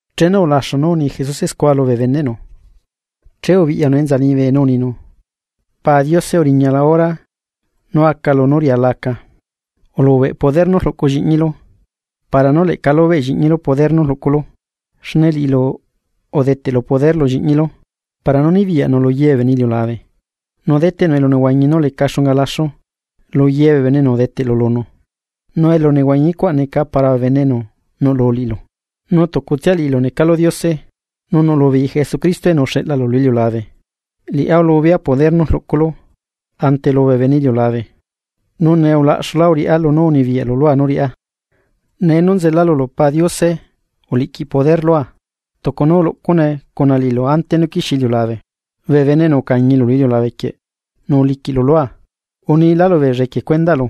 Chenu ulaxu nú uni Jesuse scua lubee beneꞌnu, che ubiꞌyanu enza liñibe nu uninu: ―Pa Diose, uriñala hora nú aca lunú riala aca. Ulubeꞌ poder nú rluꞌcu lliꞌñilu para nú leꞌca lubeꞌ lliꞌñilu poder nú rluꞌculu. Xne liꞌilu udeteꞌlu poder lu lliꞌñilu para nú nibiyaꞌnu luye bee bene iliulabe, nu deteꞌnu elunehuañi nú leca xunga laxu luye bee bene, enu udeteꞌlu lunu. Nu elunehuañicuaꞌ neca para bee bene enu nuꞌlu liꞌilu, nú tucutsia liꞌilu necalu Diose nu nuꞌlu beei Jesucristo enu uxeꞌlalu lu iliulabe. ’Liꞌá ulubea poder nú rluꞌculu ante lubee bene iliulabe, nu nee ulaꞌxula rriꞌá beenú unibiyaꞌlu lua nú riꞌá. Nee nú nzela lulu Pa Diose uliꞌquiꞌ poder lua tucu nú uluꞌcune cuna liꞌilu ante nú quixie iliulabe. ’Bee bene enu ucañilu lu iliulabe quieꞌ nu uliquiꞌlu lua, unila lubeella equie cuendaꞌlu.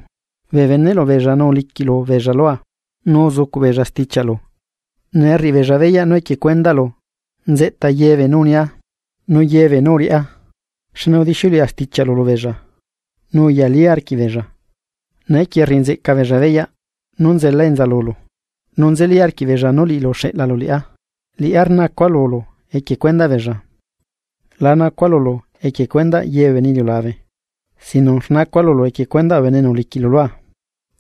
Bee beneꞌlu beella nu uliquiꞌlu beella lua nu uzucuꞌ beella stichiaꞌlu. Nee rriꞌi beella beyaꞌ nú equie cuendaꞌlu nzeꞌta ye beenú unia nu ye beenú uriꞌá, xne udixiuleꞌa stichiaꞌlu lubeella, nu uyali arquiꞌbeella. Neequie rriꞌi nzeꞌca beella beyaꞌ nú nzela enza lulu, nu nzeli arquiꞌ beella nú liꞌilu uxeꞌlalu liꞌá. ’Liꞌá rnacua lulu equie cuendaꞌ beella, la nacua lulu equie cuendaꞌ ye bee bene iliulabe, sino que rnacua lulu equie cuendaꞌ bee bene enu uliquiꞌlu lua,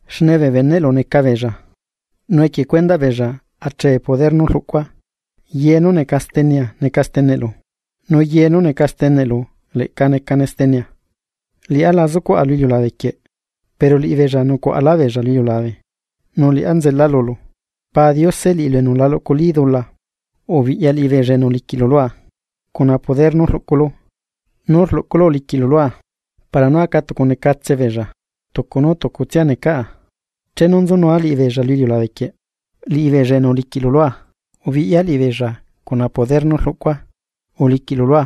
xne bee beneꞌlu neca beella. Nu equie cuendaꞌ beella achee poder nú rluꞌcua. Ye nú neca stenea neca steneꞌlu nu ye nú neca steneꞌlu leꞌca necane stenea. ’Liꞌá la zucuaꞌa lu iliulabe quieꞌ pero liꞌibeella nucuaꞌalá beella lu iliulabe, nu liꞌá nzela lulu. Pa Diose, liꞌilu enu la luꞌculí dula ubiꞌyaa liꞌibeella enu uliquiꞌlu lua, cuna poder nú rluꞌculu uliꞌquiꞌlua para nú aca tucunecatse beella tucu nú tucutsia necaꞌa. Chenu nzunua liꞌibeella lu iliulabe quieꞌ, liꞌibeella enu uliquiꞌlu lua ubiꞌya beella cuna poder nú rluꞌcua uliquiꞌlu lua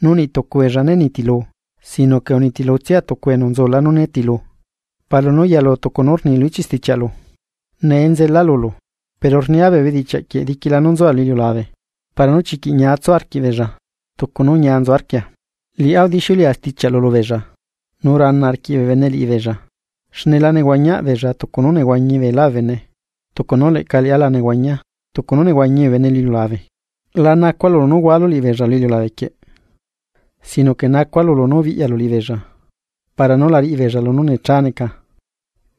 nu niꞌ tucu beella né nitilu, sino que unitilutsia tucu enu nzula nú nitilu, para nú yalu tucu nú rni lu ichiꞌ stichiaꞌlu. ’Nee nzelala lulu, pero rnia bee bedichiaꞌ quieꞌ diquila nú nzua lu iliulabe, para nú chiquiꞌ ñia tsu arquiꞌbeella tucu nú ñia nzu arquia. Liꞌá udixiuleꞌa stichiaꞌlu lubeella nu rana arquiꞌ bee bene liꞌibeella, xne la nehuañiaꞌ beella tucu nú nehuañi beelá bee bene, tucu nú leꞌca liꞌá la nehuañia tucu nú nehuañi bee bene iliulabe. La nacua lulu nú hualu liꞌibeella lu iliulabequieꞌ, sino que nacua lulu nú biꞌyalu liꞌibeella para nú la riꞌibeella nú necha neca.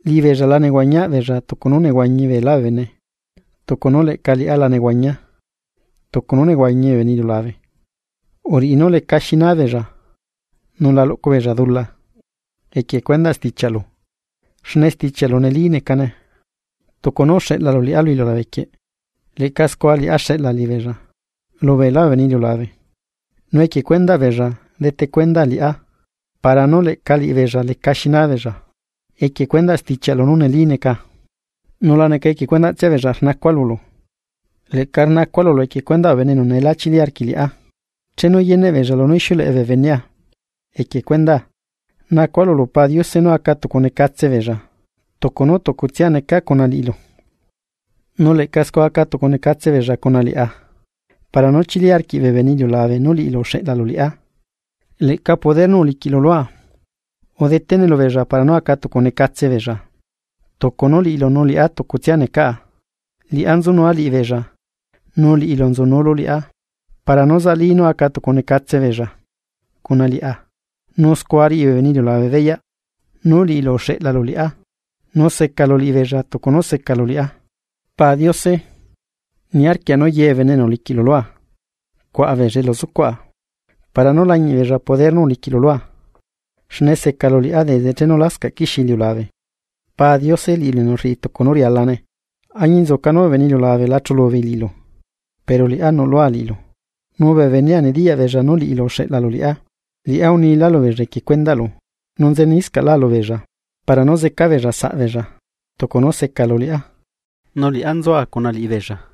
Liꞌibeella la nehuañiaꞌ beella tucunú nehuañi beelá bee bene, tucu nú leꞌca liꞌá la nehuañia tucu nú nehuañi bee bene iliulabe. Uriꞌi nú lecaxi naa beella nu la luꞌcu beella dula, equie cuendaꞌ stichiaꞌlu. Xne stichiaꞌlu neli necane. Tucu nú uxeꞌlalu liꞌá lu iliulabe quieꞌ, leꞌca scua liꞌá xeꞌla liꞌibeella lu beela bee bene iliulabe, Nu equie cuendaꞌ beella dete cuendaa liꞌá para nú leꞌca liꞌibeella lecaxi naabeella equie cuendaꞌ stichiaꞌlu nú neli neca. ’Nu la neca equie cuendaꞌtsia beella rnacua lulu, leꞌca rnacua lulu lu cuendaꞌ bee bene enu neela chili arquiꞌ liꞌá chenu yeneꞌ beella lunú ixiuleꞌe bee benea equie cuendaa. Nacua lulu Pa Diose nú aca tucunecatse beella, tucu nú tucutsia necaa cuna liꞌilu, nu leꞌca scua acatucunecatse beella cuna liꞌá, para nú chili arquiꞌ bee bene iliulabe nú liꞌilu uxeꞌlalu liꞌá lu iliulabe. Leꞌca liꞌi poder nú uliquiꞌlu lua, udetene lubeella para nú acatucunecatse beella tucu nú liꞌilu nu liꞌá tucutsia necaꞌa. Liꞌá nzunua liꞌibeella nu liꞌilu nzunulu liꞌá para nú zaꞌlí nú acatucunecatse beella cuna liꞌá, nu scua riꞌi bee bene iliulabe beyaꞌ nú liꞌilu uxeꞌlalu liꞌá nu secalu liꞌibeella tucu nú secalu liꞌá. ’Pa Diose, niarquia nú ye bee bene enu uliquiꞌlu lua cuaꞌa beella elu zucuaꞌa, para nú lañiꞌ beella poder nú uliquiꞌlu lua xne secalu liꞌá desde chenu lascaꞌ quixie iliulabe. Pa Diose, liꞌilu enu rriꞌi tucu nú rialane, añinzuca nú bee bene iliulabe lá chulu beei liꞌilu pero liꞌá nuꞌlua liꞌilu, nu bee benea nediyaꞌ beella nú liꞌilu uxeꞌlalu liꞌá. Liꞌá unila lubeella equie cuendaꞌlu nu nzeniscaꞌla lubeella, para nú zeca beella saꞌbeella tucu nú secalu liꞌá nu liꞌá nzua cuna liꞌibeella.